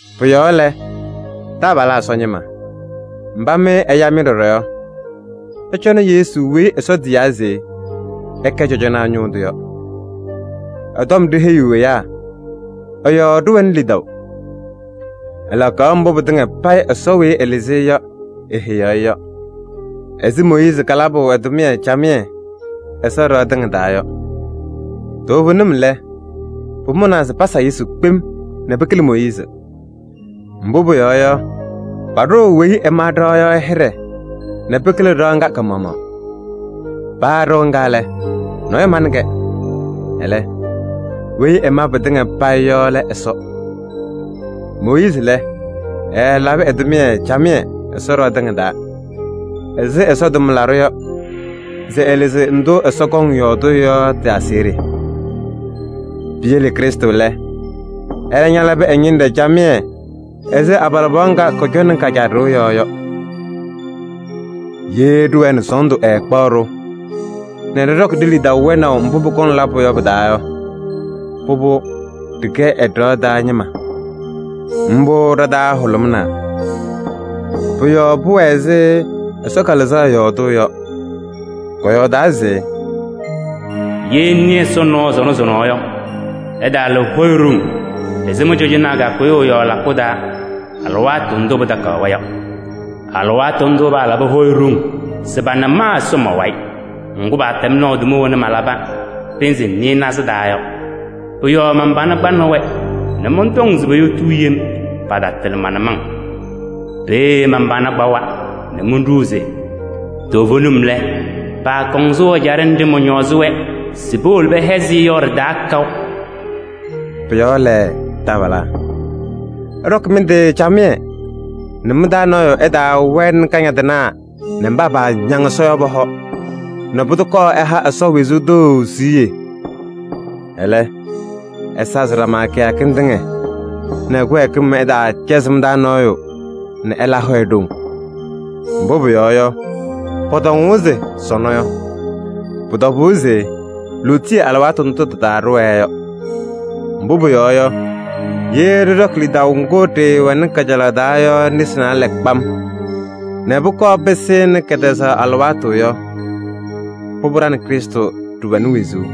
Pʋ-yɔɔ lɛ, taabalaa Ɛsɔ ñɩma mba mɩ ɛya-mɩ ɖɔɖɔ yɔ, ɩcɔnɩ Yesu weyi Ɛsɔ tiyaa se ɛkɛ cɔjɔnaa ñʋʋ tʋ yɔ. Ɛ-tɔm ɖiheyiɣ ɛyaa, ɛ-yɔɔ ɖɩwɛnɩ lidaʋ. Ɛlakaɣ mbʋ pɩtɩŋa payɩ Ɛsɔ weyi ɛlɩzɩ-ɩ yɔ eheyaɣ-i yɔ ɛzɩ Mooyiizi kalabʋ ɛ-tʋmɩyɛ camɩyɛ Ɛsɔ ɖɩɣa tɩŋa taa yɔ. Toovenim lɛ, pʋmʋnaa se pasa Yesu kpem nɛ pɩkɩlɩ Mooyiizi. Mbʋ pʋyɔɔ yɔ, paɖʋʋ weyi ɛma ɖɩɣa yɔ hɩɖɛ nɛ pɩkɩlɩ ɖɩɣa ŋga ka-maɣmaɣ. Paa ɖɩɣa ŋga lɛ, nɔɔyʋ manɩ-kɛ. Ɛlɛ, weyi ɛma pɩtɩŋa payɩ yɔ lɛ Ɛsɔ. Mooyiizi lɛ, ɛɛlabɩ ɛ-tʋmɩyɛ camɩyɛ Ɛsɔ ɖɩɣa tɩŋa taa ɛzɩ Ɛsɔ tʋmlaɖʋ yɔ se ɛlɩzɩ tɔm ndʋ Ɛsɔ kɔŋ yɔɔdʋʋ yɔ tɩ-aseɣɖe. Piyele Krɩstʋ lɛ, ɛlɛ ñalabɩ ɛ-ñɩnɖɛ camɩyɛ ɛzɩ abalɩbɩɣa ŋga kɔcɔŋnɩ ka-caa ɖɩɣa yɔɔ yɔ. Ye ɖɩwɛɛ nɛ sɔɔndʋ ɛɛkpaɣ-ɖʋ nɛ ɖɩɖɔkɩ ɖe-lidaʋ wɛnaʋ mbʋ pʋkɔŋ labʋ yɔ pɩ-taa yɔ, pʋbʋ, ɖɩkɛ ɛ-ɖɩɣa taa ñɩma. Mbʋ ɖa-taa hʋlʋmɩnaa. Pʋ-yɔɔ pʋwɛ ɛzɩ Ɛsɔ Kalɩzaɣ yɔɔdʋʋ yɔ. Kɔyɔɔdaa se: “Ye ɩnɩ Ɛsɔ nɔɔ sɔnɔ sɔnɔ yɔ, ɩtaala hɔyɛ ɖoŋ ɛzɩ mɩ-cɔzɔnaa kakʋyʋʋ ɛ-yɔɔ lakʋ taa alɩwaatʋ ndʋ pɩtakaɣ-wɛ yɔ. Alɩwaatʋ ndʋ palabɩ hɔyɛ ɖoŋ se pana ma Ɛsɔ ma-wayɩ. Ŋgʋ, pɛtɛm naʋ tʋma wena malabɩ pɩnzɩ nɩɩnaza taa yɔ. Pʋ-yɔɔ man-pana kpanɩ-wɛ nɛ mɔntɔŋ se poyotuu yem, patatɩlɩ ma-nʋmɔŋ. Peeye man-pana kpawa nɛ monɖuu se: ‘Toovenim lɛ, paakɔŋ sʋʋ ɛjaɖɛ nɖɩ mɔñɔɔzɩ-wɛ se powolo pɛhɛzɩ yɔ ɖɩ-taa kaʋ.’” Pʋ-yɔɔ lɛ, taabalaa! Ɩɖɔkɩ mɩ-tɩ camɩyɛ nɛ mɩ-taa nɔɔyʋ ɛtaawɛnɩ kañadɩnaa nɛ mba paañaŋ Ɛsɔ yɔ pɔ-hɔ nɛ pʋdʋ kɔɔ ɛha Ɛsɔ wezuu tʋ siɣye! Ɛlɛ, ɩsazɩ ɖama kɩyakɩŋ tɩŋa nɛ kɩwɛɛkɩm ɛtaacɛzɩ mɩ-taa nɔɔyʋ nɛ ɛla hɔyɛ ɖoŋ. Mbʋ pʋyɔɔ yɔ, pɔtɔŋʋʋ se: “Sɔnɔ” yɔ, pʋ-tɔbʋʋ se lootiye alɩwaatʋ ndʋ tɩ-taa ɖɩwɛɛ yɔ. Mbʋ pʋyɔɔ yɔ, ye ɖɩɖɔkɩ lidaʋ ŋgʋ ɖɩɩwɛnɩ kajalaɣ taa yɔ nesi naalɛ kpam nɛ pʋkɔɔ pɩsɩnɩ kɛtɛzaɣ alɩwaatʋ yɔ, pʋbʋ, ɖa nɛ Krɩstʋ ɖɩwɛnɩ wezuu.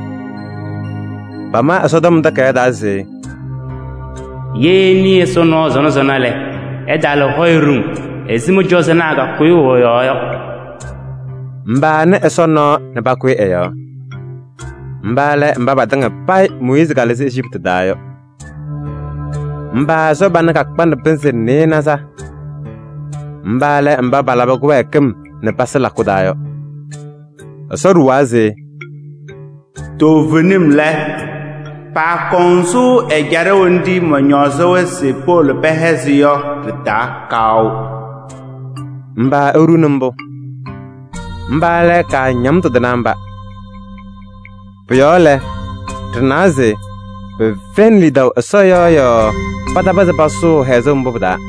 Pama Ɛsɔtɔm Takayaɣ taa se: “Ye ɩnɩ Ɛsɔ nɔɔ sɔnɔ sɔnɔ lɛ, ɩtaala hɔyɛ ɖoŋ ɛzɩ mɩ-cɔzɔnaa kakʋyʋʋ ɛ-yɔɔ yɔ.” Mba panɩ Ɛsɔ nɔɔ nɛ pakʋyɩ ɛ-yɔɔ? Mba lɛ mba patɩŋa payɩ Mooyiizi kalɩzɩnɩ Ejiptɩ yɔ. Mba Ɛsɔ pana kakpanɩ pɩnzɩ nɩɩnaza? Mba lɛ mba palabɩ kɩwɛɛkɩm nɛ pasɩ lakʋ taa yɔ. Ɛsɔ ɖuwaa se: “Toovenim lɛ, paakɔŋ sʋʋ ɛjaɖɛ nɖɩ mɔñɔɔzɩ-wɛ se powolo pɛhɛzɩ yɔ ɖɩ-taa kaʋ.” Mba eɖuuni mbʋ? Mba lɛ kaañamtʋ tɩnaa mba. Pʋ-yɔɔ lɛ, ɖɩnawa se pɛfɛyɩnɩ lidaʋ Ɛsɔ yɔɔ yɔɔ patapɩzɩ pasʋʋ hɛzʋʋ mbʋ pɩ-taa.